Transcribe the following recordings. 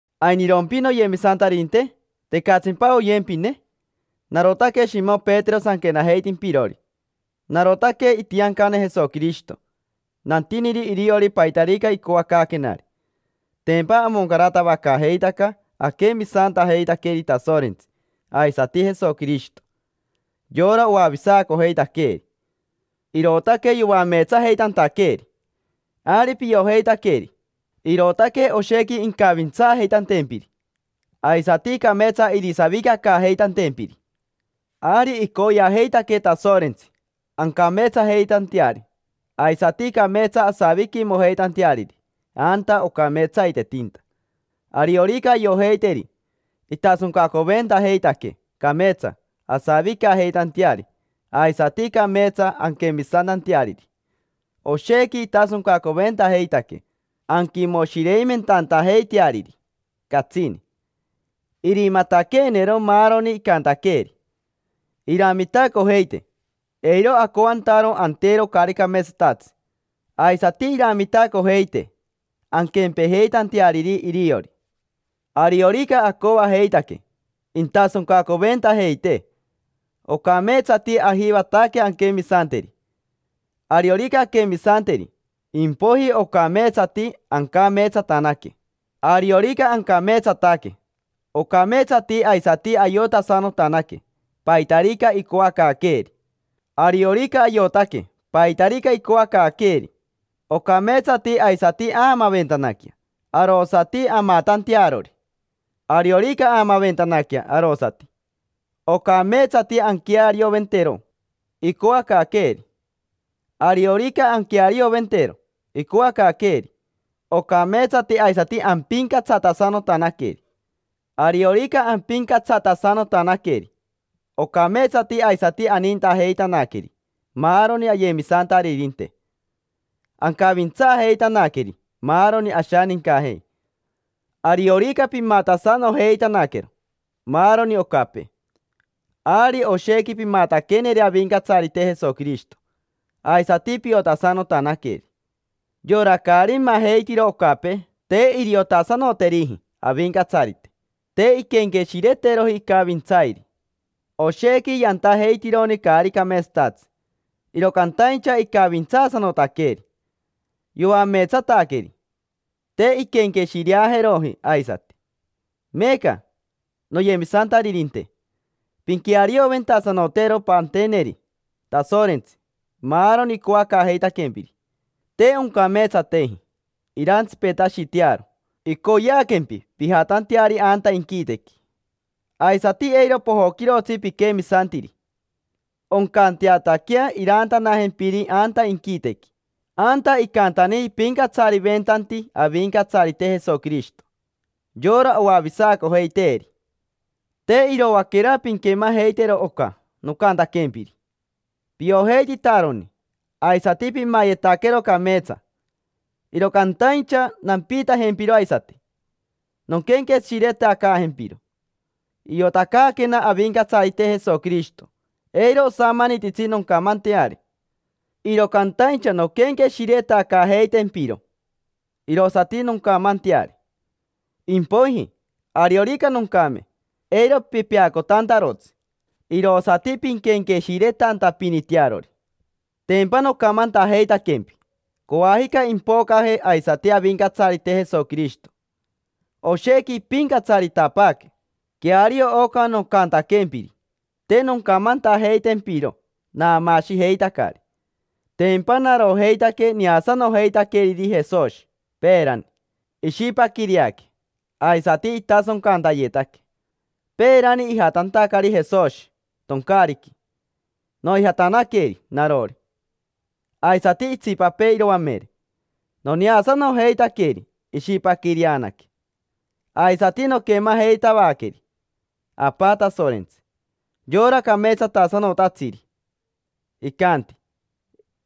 ¿Ainirompi noyemisantaririnte? ¿Tecatsimpa oyempine? Narotaque Shimo Petero sanquenajeitimpirori. Narotaque itiancane Jesoquirishito, nantiniri iriori paitarica icoacaaquenari. Tempa amoncaratavacaajeitaca aquemisantajeitaqueri Tasorentsi aisati Jesoquirishito, yora oavisacojeitaqueeri. Irootaque yoameetsajeitantaqueeri. Ari piojeitaqueri, irootaque oshequi incavintsaajeitantempiri aisati cameetsa irisavicacaajeitantempiri. Ari icoyeajeitaquee Tasorentsi ancameetsajeitanteari aisati cameetsa asaviquimojeitanteariri anta ocameetsaitetinta. Ariorica ayojeiteri, intasoncacoventajeitaquee cameetsa asavicajeitanteari aisati cameetsa anquemisantanteariri. Oshequi intasoncacoventajeitaquee anquimoshireimentantajeiteariri catsini, irimataqueenero maaroni icantaqueeri. Iramitacojeitee eiro acoantaro antero caari cameetsatatsi. Aisati iramitacojeitee anquempejeitanteariri iriori. Ariorica acoajeitaque intasoncacoventajeitee, ocameetsati ajivataque anquemisanteri. Ariorica anquemisanteri, impoiji ocameetsati ancameetsatanaque. Ariorica ancameetsataque ocameetsati aisati ayotasanotanaque paitarica icoacaaqueeri. Ariorica ayotaque paitarica icoacaaqueeri, ocameetsati aisati aamaventanaquea arosati amatantearori. Ariorica aamaventanaquea arosati, ocameetsati anquearioventero icoacaaqueeri. Ariorica anquearioventero icoacaaqueeri, ocameetsati aisati ampincatsatasanotanaqueri. Ariorica ampincatsatasanotanaqueri, ocameetsati aisati anintajeitanaqueri maaroni ayemisantaririnte, ancavintsaajeitanaqueri maaroni ashanincajei. Ariorica pimatasanojeitanaquero maaroni ocapee, ari oshequi pimataqueneri Avincatsarite Jesoquirishito, aisati piotasanotanaqueri. Yora caari majeitiro ocapee te iriotasanoteriji Avincatsarite, te inquenqueshireteroji icavintsairi. Oshequi yantajeitironi caari cameetsatatsi, iro cantaincha icavintsaasanotaqueri, yoameetsataqueri, te inquenqueshireajeroji aisati. Meeca, noyemisantaririnte, pinquearioventasanotero panteneri Tasorentsi maaroni icoacaajeitaquempiri, te oncameetsateji irantsipetashitearo icoyeaquempi pijatanteari anta inquitequi. Aisati eiro pojoquirotsi piquemisantiri, oncanteataquea iraantanajempiri anta inquitequi, anta icantani ipincatsariventanti Avincatsarite Jesoquirishito: yora oavisacojeiteeri. Te iroaquera pinquemajeitero oca nocantaquempiri: piojeititaroni, aisati pimayetaquero cameetsa. Iro cantaincha nampiitajempiro aisati nonquenqueshiretacaajempiro. Iotacaaquena Avincatsarite Jesoquirishito eiro osamanititsi noncamanteari. Iro cantaincha nonquenqueshiretacaajeitempiro irosati noncamanteari. Impoiji, ariorica noncame, eiro pipeacotantarotsi, irosati pinquenqueshiretantapinitearori. Tempa nocamantajeitaquempi coajica impocaje aisati Avincatsarite Jesoquirishito, oshequi impincatsaritapaaque. Queario oca nocantaquempiri, te noncamantajeitempiro naamaashijeitacari. Tempa narojeitaque neasanojeitaqueriri Jesoshi peerani ishipaquireaque aisati itasoncantayetaque. Peerani ijatantacari Jesoshi toncaariqui, noijatanaqueri narori, aisati itsipapee iroamere; noneasanojeitaqueri ishipaquireanaque, aisati noquemajeitavaqueri Apa Tasorentsi, yora cameetsatasanotatsiri. Icanti: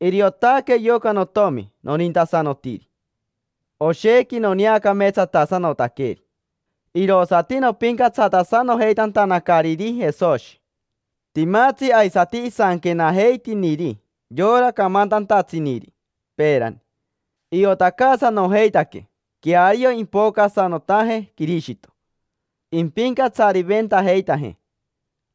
“Iriotaque yoca notomi nonintasanotiri, oshequi noneacameetsatasanotaqueri”. Irosati nopincatsatasanojeitantanacariri Jesoshi. Timatsi aisati isanquenajeitiniri yora camantantatsiniri peerani: iotacaasanojeitaquee queario impocasanotaje Quirishito, impincatsariventajeitajee.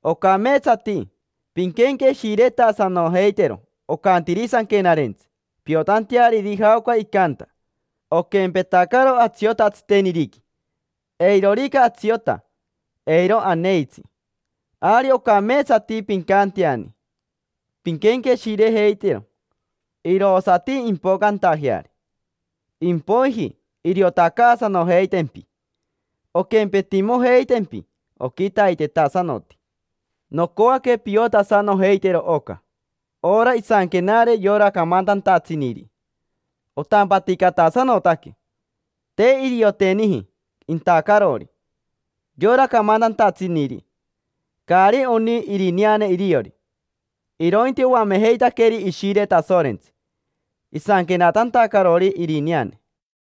Ocameetsati pinquenqueshiretasanojeitero ocantiri Sanquenarentsi piotanteariri jaoca icanta. Oquempetacaro atsiota tsiteniriqui: eirorica atsiota, eiro aneitsi. Ari ocameetsati pincanteani pinquenqueshirejeitero, irosati impocantajeari; impoiji iriotacaasanojeitempi, onquempetimojeitempi oquitaitetasanoti. Nocoaque piotasanojeitero oca: ora isanquenare yora camantantatsiniri otampaticatasanotaque. Te irioteniji intacarori, yora camantantatsiniri, caari oni irineane iriori; irointi oamejeitaqueri Ishire Tasorentsi, isanquenatantacarori irineane.